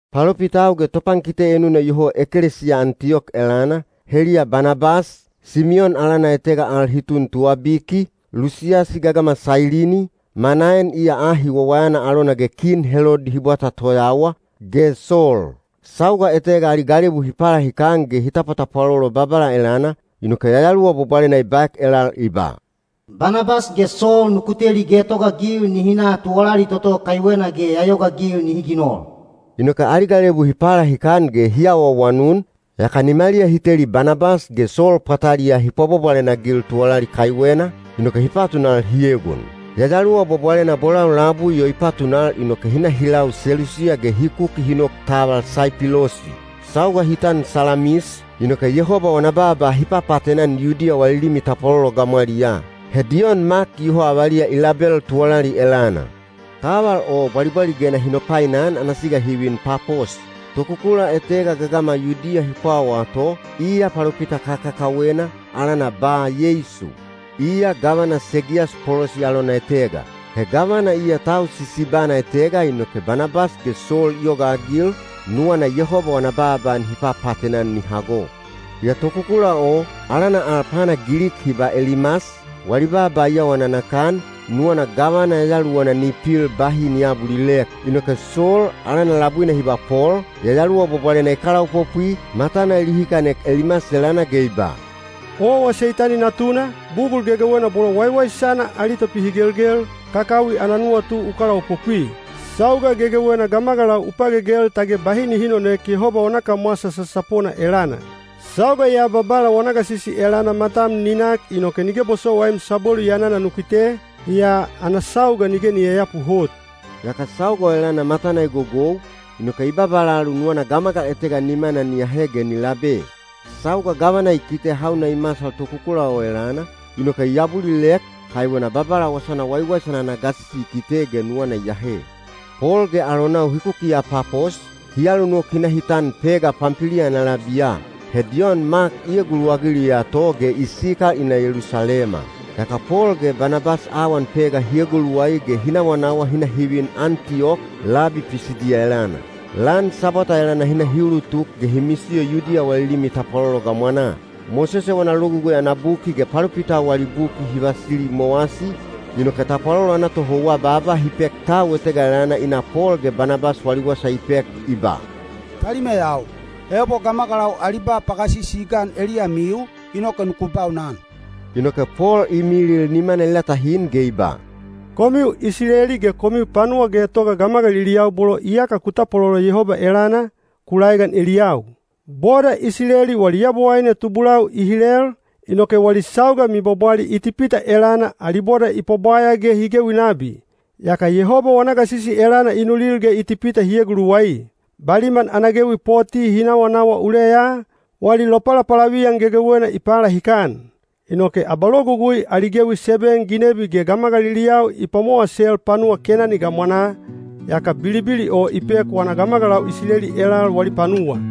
Palopitau ge topankite enuna iyoho ekelesiya Antiyok elana, heliya Banabas, Simiyon alana etega al hi tun Tuwabiki, Lusiyasi gagama Sailini, Manaen iya ahi wawayana alona ge Kin Helodi hi bwata toyawa, ge Sol. Sauga etega ali galebu hi palahikan ge hi tapwatapwalolo Babala elana, inoke Yayaluwa Bwabwalena i baek elal i ba, “Banabas ge Sol nuku teli getogaagil nihi na tuwalali toto kaiwena ge ya yogaagil nihi ginol.” Inoke ali galebu hi palahikan ge hi awaawanun, yaka nimaliya hi teli Banabas ge Sol pwataliyaa hi pwabwabwalena-agil tuwalali kaiwena, inoke hi patunal hi egon. Yayaluwa Bwabwalena bolau labui o i patunal inoke hi na hi lau Selusiya ge hi kuki hi nok taval Saipilosi. Sauga hi tan Salamis, inoke Yehoba wana baaba hi papaatena-an Yudiya wali limi tapwalolo gamwaliyaa. He Diyon Mak iyoho avaliya i label tuwalali elana. Taval o bwalibwaligena hi nopainan ana siga hi vin Papos. Tokukula etega gagama Yudiya hi pwawaa to, iya palopita kakakawena, alana Ba-Yeisu. Iya gavana Segiyas Polosi alona etega. He gavana iya tau sisibana etega inoke Banabas ge Sol i yogaagil, nuwana Yehoba wana baaba nihi papaatena-an ni hago. Yaa tokukula o, alana al pana Gilik hi ba Elimas, wali baaba i awa nanakan, nuwana gavana yayaluwana ni pil bahi ni aabulilek. Inoke Sol, alana labuina hi ba Pol, Yayaluwa Bwabwalena i kalaopopwi, matana i lihikanek Elimas elana ge i ba, “Owa Seitani natuna, bugul gegewena bolo waiwaisana ali topihigelgel, kakawi ana nuwatu u kalaopopwi. Sauga gegewena gamagalau u pagegel tage bahi nihi nonoek Yehoba wana kamwasa sasapona elana. Sauga ya Babala wana gasisi elana matam ni nak inoke nige bosowaim sabwelu yanana nu kite, yaa ana sauga nige ni yayapu hot.” Yaka sauga o elana matana i gogou, inoke i babalalu nuwana gamagal etega nimana ni ahe ge ni labe. Sauga gavana i kite hauna i masal tokukula o elana, inoke i abulilek, kaiwena Babala wasana waiwaisana ana gasisi i kite ge nuwana i ahe. Pol ge alonau hi kukiya Papos, hi alunok hi na hi tan Pega Pampiliya ana labiya. He Diyon Mak i eguluwagiliya to ge i sikal i na Yelusalema. Yaka Pol ge Banabas awan Pega hi eguluwai ge hi nawanawa hi na hi vin Antiyok, labi Pisidiya elana. Lan Sabwata elana hi na hi ulutuk ge hi misiyo Yudiya wali limi tapwalolo gamwanaa. Mosese wana Logugui ana buki ge palopitau wali buki hi vasili i mowasi, inoke tapwalolo ana tohouwa baaba hi pek tau etega elana i na Pol ge Banabas wali wasa i pek i ba, “Talimeyau, ebo gamagalau ali ba pagasisi i gan eliyamiu, inoke nuku baunan.” Inoke Pol i milil nimana i latahin ge i ba, “Komiu Isileli ge komiu panuwa getoga gamagaliliyau bolo iyaka ku tapwalolo Yehoba elana, ku laegan eliyau! Boda Isileli wali Yabowaine tubulau i hilel, inoke wali sauga mibwabwali Itipita elana ali boda i pwabwaya ge hi gewi nabi. Yaka Yehoba wana gasisi elana i nulil ge Itipita hi eguluwai. Baliman ana gewi poti hi nawanawa uleya, wali lopalapalaviyan gegewena i palahikan. Inoke abalogugui ali gewi seben ginebi ge gamagaliliyau i pwamowasel panuwa Kenani gamwanaa, yaka bilibili o i pek wana gamagalau Isileli elal wali panuwa.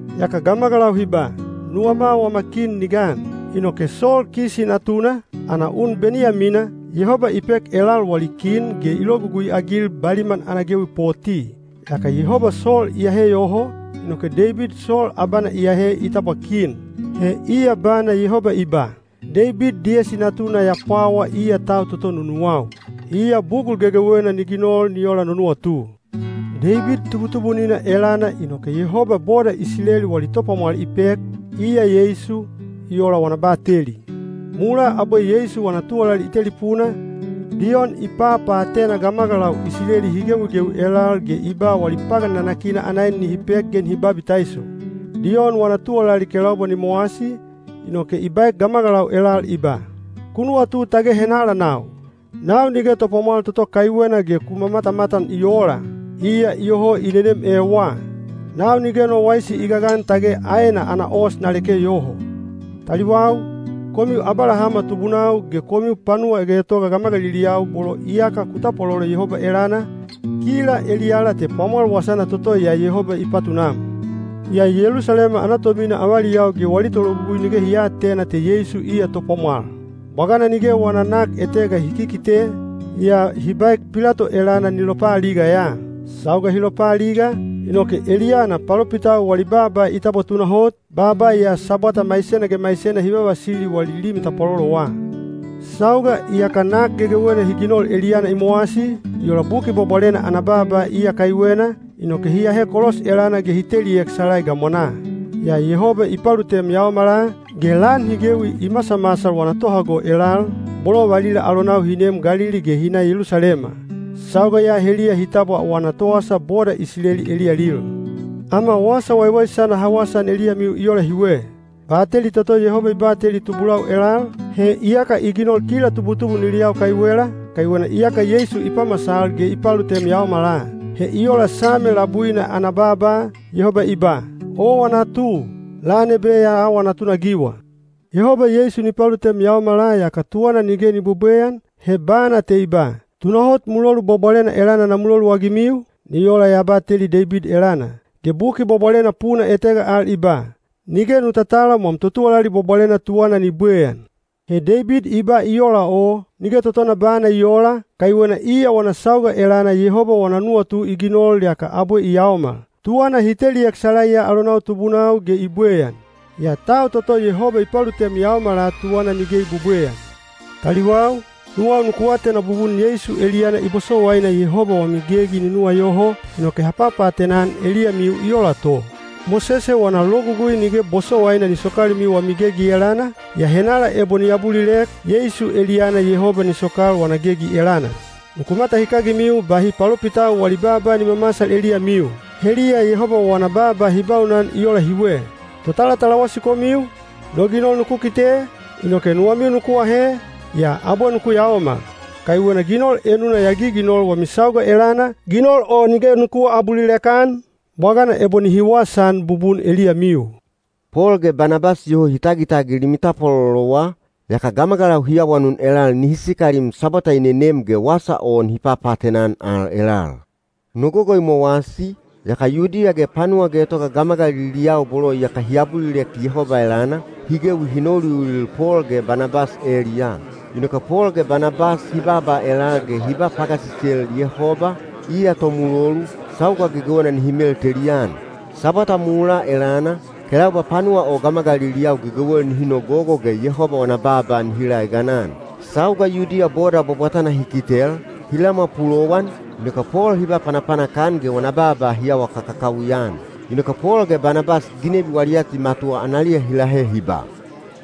Yaka gamagalau hi ba, ‘Nuwama wama kin ni gan.’ Inoke Sol Kisi natuna, ana un Beniyamina, Yehoba i pek elal wali kin ge i logugui-agil baliman ana gewi poti. Yaka Yehoba Sol i ahe yoho, inoke Deibid Sol abana i ahe i tabwa kin. He iya bana Yehoba i ba, ‘Deibid Diyesi natuna ya pwawa iya tau toto nunuwau. Iya bugul gegewena ni ginol ni ola no nuwatu.’ Deibid tubutubunina elana inoke Yehoba boda Isileli wali topwamwal i pek, iya Yeisu, i ola wana bateli. Mulaa abwe Yeisu wana tuwalali i telipuna, Diyon i papaatena gamagalau Isileli hi gewigewi elal ge i ba wali pagan nanakina ana en nihi pek ge nihi babitaiso. Diyon wana tuwalali kelaubwa ni mowasi, inoke i baek gamagalau elal i ba, ‘Ku nuwatu tage henala nau? Nau nige topwamwal toto kaiwena ge ku matamatan i oola. Iya iyoho i nenem ewa. Nau nige no waisi i gagan tage aena ana os na leke yoho.’ Taliwau ge nuwau, komiu Abalahama tubunau ge komiu panuwa getoga gamagaliliyau bolo iyaka ku tapwalolo Yehoba elana, kila eliyala te pwamwal wasana toto ya Yehoba i patunam. Yaa Yelusalema ana tomina avaliyau ge wali tologugui nige hi aatena te Yeisu iya topwamwal. Bwagana nige wana nak etega hi kikite, yaa hi baek Pilato elana ni lopaaliga ya. Sauga hi lopaaliga, inoke eliyana palopitau wali baaba i tabwa tunahot, baaba ya Sabwata maisena ge maisena hi vavasili wali limi tapwalolowa. Sauga iyaka nak gegewena hi ginol eliyana i mowasi, i ola Buki Bwabwalena ana baaba iya kaiwena, inoke hi ahe kolos elana ge hi teliek salai gamwanaa. Yaa Yehoba i palutem yaomala, ge lan hi gewi i masamasal wana tohago elal, bolo valila alonau hi neem Galili ge hi na Yelusalema. Sauga ya heliya hi tabwa wana towasa boda Isileli eliyalil. Ama wasa waiwaisana ha wasaan eliyamiu i ola hiwe: bateli toto Yehoba i bateli tubulau elal, he iyaka i ginol kila tubutubuniliyau kaiwela, kaiwena iyaka Yeisu i pamasal ge i palutem yaomala. He i ola Same labuina ana baaba, Yehoba i ba: ‘Owa natu; lan ebe ya awa natunagiwa.’ Yehoba Yeisu ni palutem yaomala yaka tuwana nige ni bwebweyan, he bana te i ba: ‘Tunahot mulolu bwabwalena elana na muloluagimiu, ni ola ya bateli Deibid elana.’ Ge Buki Bwabwalena puna etega al i ba: ‘Nige nu tatalam wam totuwalali bwabwalena tuwana ni bwebweyan.’ He Deibid i ba i ola o, nige totona bana i oola, kaiwena iya wana sauga elana Yehoba wana nuwatu i ginol yaka abwe i yaomal. Tuwana hi teliek salaiya alonau tubunau ge i bweyan. Yaa tau toto Yehoba i palutem yaomala tuwana nige i bwebweyan. Taliwau ge nuwau, nuwau nuku atena bubun Yeisu eliyana i bosowaina Yehoba wami gegi ni nuwayoho, inoke ha papaatena-an eliyamiu i ola to. Mosese wana Logugui nige bosowaina ni sokalimiu wami gegi elana, yaa henala ebo ni abulilek, Yeisu eliyana Yehoba ni sokal wana gegi elana. Nuku matahikagimiu bahi palopitau wali baaba ni mamasal eliyamiu. Heliya Yehoba wana baaba hi baunan i ola hiwe: Totalatalawasi komiu, no ginol nuku kite, inoke nuwamiu nuku ahe, yaa abwe nuku yaomal. Kaiwena ginol enuna ya giginol wami sauga elana, ginol o nige nuku aabulilek-an, bwagana ebo nihi wasaan bubun eliyamiu.” Pol ge Banabas iyoho hi tagitagil limi tapwalolowa, yaka gamagalau hi awanun elal nihi sikalim Sabwata i nenem ge wasa o nihi papaatena-an al elal. Nogogo i mowasi, yaka Yudiya ge panuwa getoga gamagaliliyau bolo iyaka hi abulilek Yehoba elana, hi gewi hi nouliulil Pol ge Banabas eliyaa. Inoke Pol ge Banabas hi baaba elal ge hi ba pagasisel Yehoba, iya tomulolu, sauga gegewena nihi meltelian. Sabwata mulaa elana, kelaubwa panuwa o gamagaliliyau gegewel nihi nogogo ge Yehoba wana baaba nihi laeganan. Sauga Yudiya boda bwabwatana hi kitel, hi lamwa pulowan, inoke Pol hi ba panapanak-an ge wana baaba hi awa kakakawi-an. Inoke Pol ge Banabas ginebi wali atimatuwa analiya hi lahe hi ba,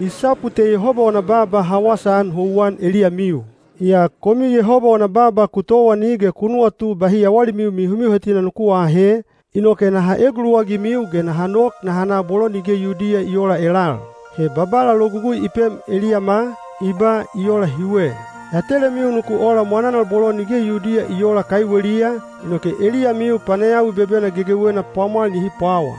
“I sapu te Yehoba wana baaba ha wasaan houwan eliyamiu. Yaa komiu Yehoba wana baaba ku towani ge ku nuwatu bahi yawalimiu mihomihotina nuku aahe, inoke naha eguluwagimiu ge naha nok naha na bolo nige Yudiya i oola elal. He Babala logugui i pem eliyama, i ba i ola hiwe: ‘Ya telemiu nuku ola mwananal bolo nige Yudiya i oola kaiweliya, inoke eliyamiu panayawi bebena gegewena pwamwal nihi pwawa.’”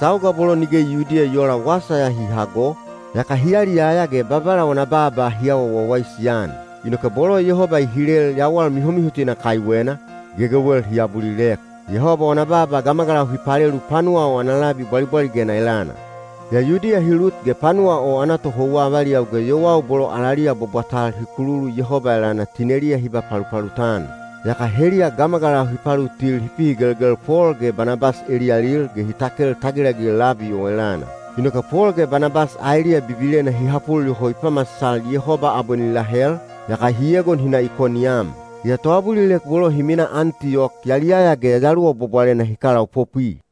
Sauga bolo nige Yudiya i oola wasa ya hi hago, yaka hi yaliyaya ge Babala wana baaba hi awa wawaisi-an. Inoke bolo Yehoba i hilel yawal mihomihotina kaiwena, gegewel hi abulilek. Yehoba wana baaba gamagalau hi palelu panuwa o ana labi bwalibwaligena elana. Yaa Yudiya hi lut ge panuwa o ana tohouwa avaliyau ge yowau bolo alaliya bwabwatal hi kululu Yehoba elana tineliya hi ba palupalut-an. Yaka heliya gamagalau hi palutil hi pihigelgel Pol ge Banabas eliyalil ge hi takel tagilagil labi o elana. Inoke Pol ge Banabas aeliya bibilena hi hapul yoho i pamasal Yehoba abwe ni lahel, yaka hi egon hi na Ikoniyam. Yaa toabulilek bolo hi minaa Antiyok yaliyaya ge Yayaluwa Bwabwalena hi kalaopopwi.